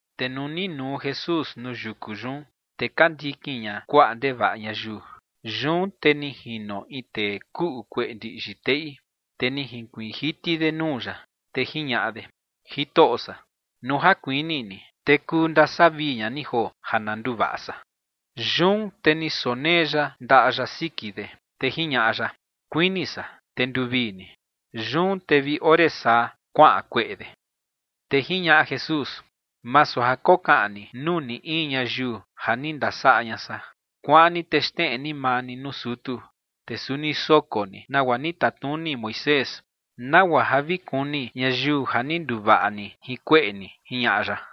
Te nuu ni nuu Jesús nuu yuku yun, te ka ndikin ña kuaꞌa ndevaꞌa ñayiu. Yun te ni jino in tee kuꞌu kueꞌe ndiꞌyi teꞌi, te ni jinkuiin jiti de nuu ya, te jiñaꞌa de: ͏―͏Jitoꞌo san, nuu ja kuini ni, te kuu ndasavii ña ni joo ja na nduvaꞌa san. Yun te ni sonee ya ndaꞌa ya siki de, te jiñaꞌa ya: ͏―͏Kuini san, te nduvii ni. Yun te vi ore saa kuaꞌan kueꞌe yun. Te jiñaꞌa Jesús: ͏―͏Masu ja kokaꞌan ni nuu ni in ñayiu ja ni ndasaꞌa ña san. Kuaꞌan ni te xneꞌe ni maa ni nuu sutu, te suni soko ni nagua ni tatnuni Moisés, nagua ja vi kuni ñayiu ja ni nduvaꞌa ni jin kueꞌe ni ͏―͏jiñaꞌa ya.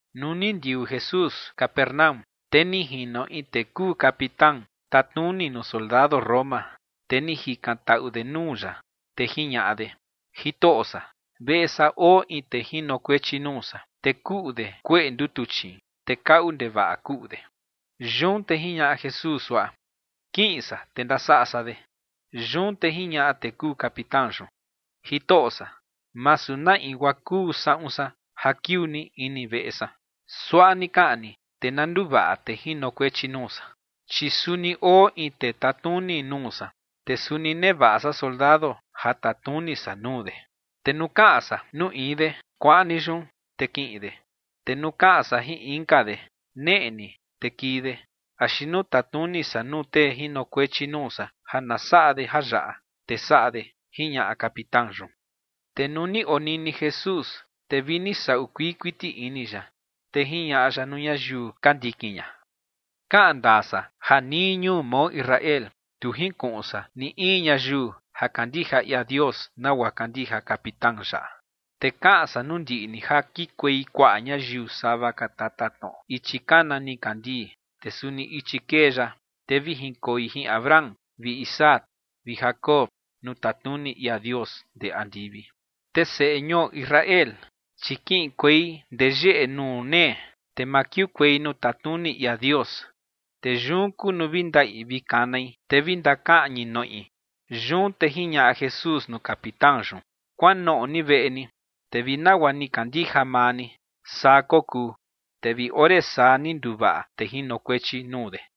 Nuu ni ndiuu Jesús Capernaúm, te ni jino in tee kuu capitán tatnuni nuu soldado Roma, te ni jikantaꞌu de nuu ya, te jiñaꞌa de: ͏―͏Jitoꞌo san, veꞌe san oo in tee jinokuechi nuu san, te kuꞌu de kueꞌe ndutuchiin, te kaꞌu ndevaꞌa kuꞌu de. Yun te jiñaꞌa Jesús suaꞌa: ͏―͏Kiꞌin san, te ndasaꞌa san de. Yun te jiñaꞌa tee kuu capitán yun: ͏―͏Jitoꞌo san, masu na in guaa kuu saꞌun san ja kiuu ni ini veꞌe san. Suaꞌa ni kaꞌan ni, te na nduvaꞌa tee jinokuechi nuu san. Chi suni oo in tee tatnuni nuu san, te suni nevaꞌa san soldado ja tatnuni san nuu de. Te nuu kaꞌan san nuu in de “kuaꞌan ni yun”, te kiꞌin de. Te nuu kaꞌan san jin inka de “neꞌe ni”, te kii de. Axi nuu tatnuni san nuu tee jinokuechi nuu san ja na saꞌa de jayaꞌa, te saꞌa de ͏―͏jiñaꞌa capitán yun. Te nuu ni onini Jesús, te vini saꞌu kuii kuiti ini ya, te jiñaꞌa ya nuu ñayiu ka ndikin ña: ͏―͏Kaꞌan ndaa san ja nii ñuu mao Israel, tu jinkuꞌun san ni in ñayiu ja kandija ia Dios nagua kandija capitán yaꞌa. Te kaꞌan san nuu ndiꞌi ni ja kikuei kuaꞌa ñayiu sava ka tatatnoꞌo ichi kana nikandii, te suni ichi kee ya, te vi jinkoi jin Abraham vi Isaac vi Jacob nuu tatnuni ia Dios ndee andivi. Te seꞌe ñuo Israel, chi kiꞌinkuei ndee yeꞌe nuu nee, te ma kiukuei nuu tatnuni ia Dios. Te yun kuu nuu vi ndaꞌi vi kanai, te vi ndakaꞌñi noꞌi. Yun te jiñaꞌa Jesús nuu capitán yun: ―Kuanoꞌo ni veꞌe ni, te vi nagua ni kandija maa ni, saa kokuu. Te vi ore saa ni nduvaꞌa tee jinokuechi nuu de.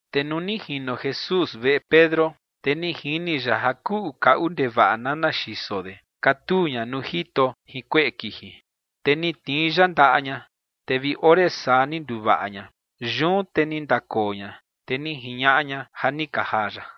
Te nuu ni jino Jesús veꞌe Pedro, te ni jini ya ja kuꞌu kaꞌu ndevaꞌa nana xiso de, katuu ña nuu jito jin kueꞌe kiji. Te ni tnii ya ndaꞌa ña, te vi ore saa ni nduvaꞌa ña. Yun te ni ndakoo ña, te ni jiñaꞌa ña ja ni ka jaa ya.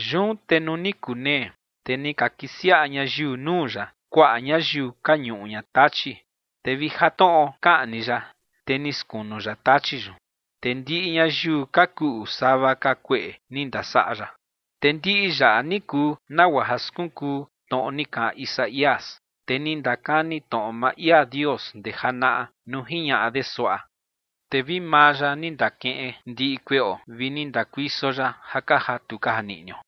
Yun te nuu ni kunee, te ni ka kisiaꞌa ñayiu nuu ya kuaꞌa ñayiu ka ñuꞌu ña tachi, te vi ja tnoꞌo kaꞌan ni ya, te ni skunu ya tachi yun. Te ndiꞌi ñayiu ka kuꞌu sava ka kueꞌe ni ndasaꞌa ya. Te ndiꞌi yaꞌa ni kuu nagua ja skunkuu tnoꞌo ni kaꞌan Isaías, tee ni ndakani tnoꞌo maa ia Dios ndee janaꞌa, nuu jiñaꞌa de suaꞌa: “Te vi maa ya ni ndakeꞌen ndiꞌi kueꞌo vi ni ndakuiso ya ja ka jatu ka janiꞌnio”.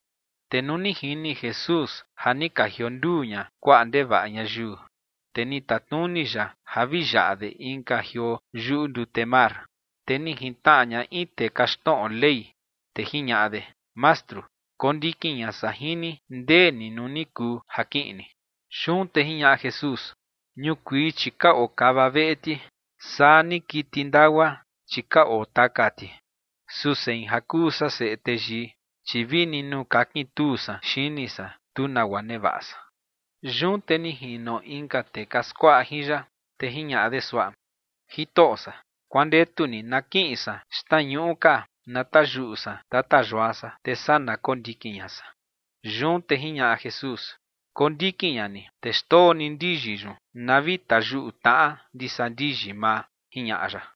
Te nuu ni jini Jesús ja ni ka jionduu ña kuaꞌa ndevaꞌa ñayiu, te ni tatnuni ya ja vi yaꞌa de inka jioo yuꞌu ndute mar. Te ni jintnaꞌa ña in tee kaxtnoꞌo Ley, te jiñaꞌa de: ͏―͏Mastru, kondikin ña san jin ni ndee ni nuu ni kuu ja kiꞌin ni. Yun te jiñaꞌa Jesús: ͏―͏Ñukuii, chi ka oo kava veꞌe ti, saa ni kiti ndagua, chi ka oo taka ti. Su sein ja kuu san Seꞌe Teyii, chi vini nuu kakintuu san xini san, tu nagua nevaꞌa san. Yun te ni jino inka tee ka skuaꞌa jin ya, te jiñaꞌa de suaꞌa: ͏―͏Jitoꞌo san, kuandetu ni na kiꞌin san xtnañuꞌu ka na tayuꞌu san tata yua san, te saa na kondikin ña san. Yun te jiñaꞌa Jesús: ͏―͏Kondikin ña ni, te xndoo ni ndiyi yun na vi tayuꞌu tnaꞌa ndisa ndiyi maa ͏―͏jiñaꞌa ya.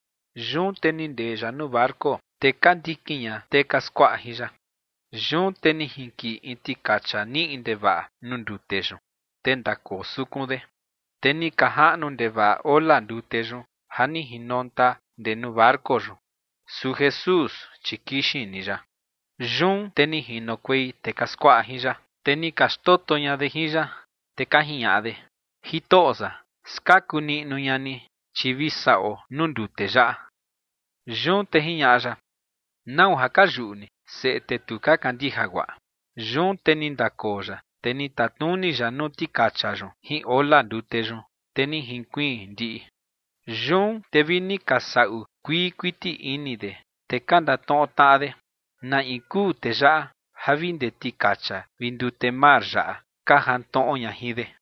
Yun te ni ndee ya nuu barco, te ka ndikin ña tee ka skuaꞌa jin ya. Yun te ni jinkiꞌi in tikacha niꞌi ndevaꞌa nuu ndute yun, te ndakoo sukun de, te ni ka jaꞌnu ndevaꞌa ola ndute yun ja ni jinonta ndee nuu barco yun. Su Jesús, chi kixin ni ya. Yun te ni jinokuei tee ka skuaꞌa jin ya, te ni ka xtoto ña de jin ya, te ka jiñaꞌa de: ͏―͏Jitoꞌo san, skaku niꞌnu ña ni, chi vi saꞌuo nuu ndute yaꞌa. Yun te jiñaꞌa ya: ͏―͏¿Nau ja ka yuꞌu ni, seꞌe tee tu ka kandija guaꞌa? Yun te ni ndakoo ya, te ni tatnuni ya nuu tikacha yun jin ola ndute yun, te ni jinkuiin ndiꞌi. Yun te vini ka saꞌu kuii kuiti ini de, te ka ndatnoꞌo tnaꞌa de: ͏―͏¿Na in kuu tee yaꞌa ja vi ndee tikacha vi ndute mar yaꞌa ka jantnoꞌo ña jin de?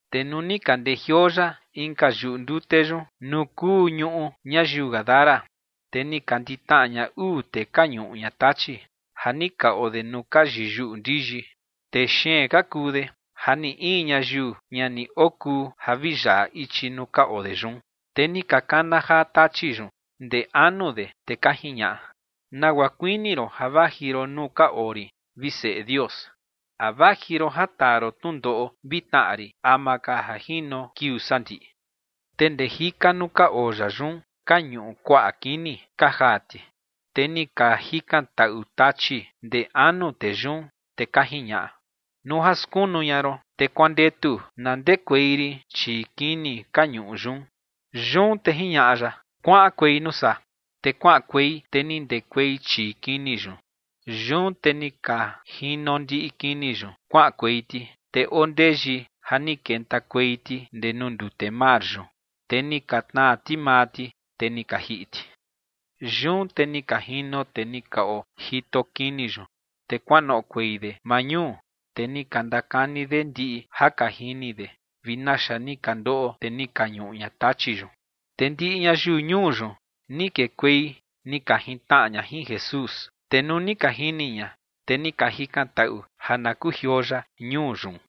Te nuu ni ka ndejioo ya inka yuꞌu ndute yun nuu kuu ñuꞌu ñayiu gadara, te ni ka nditnaꞌa ña uu tee ka ñuꞌu ña tachi, ja ni ka oo de nuu ka yiyuꞌu ndiyi. Tee xeen ka kuu de ja ni in ñayiu ña ni okuu ja vi yaꞌa ichi nuu ka oo de yun. Te ni ka kana jaa tachi yun ndee anu de, te ka jiñaꞌa: ͏―͏¿Nagua kuini ron ja vaji ron nuu ka oo rin, vi Seꞌe Dios? ¿A vaji ron ja taa ron tnundoꞌo vi tnaꞌa rin ama ka ja jino kiuu sandiꞌi? Te ndee jika nuu ka oo ya yun ka ñuꞌu kuaꞌa kini ka jaa ti. Te ni ka jikantaꞌu tachi ndee anu tee yun, te ka jiñaꞌa: ͏―͏Nuu ja skunu ña ron, te kuandetu na ndekuei rin chii kini ka ñuꞌu yun. Yun te jiñaꞌa ya: ͏―͏Kuaꞌankuei nuu saa. Te kuaꞌankuei, te ni ndekuei chii kini yun. Yun te ni ka jino ndiꞌi kini yun kuaꞌankuei ti, te oo ndeyi ja ni kentakuei ti ndee nuu ndute mar yun. Te ni ka tnaa ti maa ti, te ni ka jiꞌi ti. Yun te ni ka jino tee ni ka ojito kini yun, te kuanoꞌokuei de maa ñuu, te ni ka ndakani de ndiꞌi ja ka jini de vi naxa ni ka ndoꞌo tee ni ka ñuꞌu ña tachi yun. Te ndiꞌi ñayiu ñuu yun ni kekuei ni ka jintnaꞌa ña jin Jesús. Te nuu ni ka jini ña, te ni ka jikantaꞌu ja na kujioo ya ñuu yun.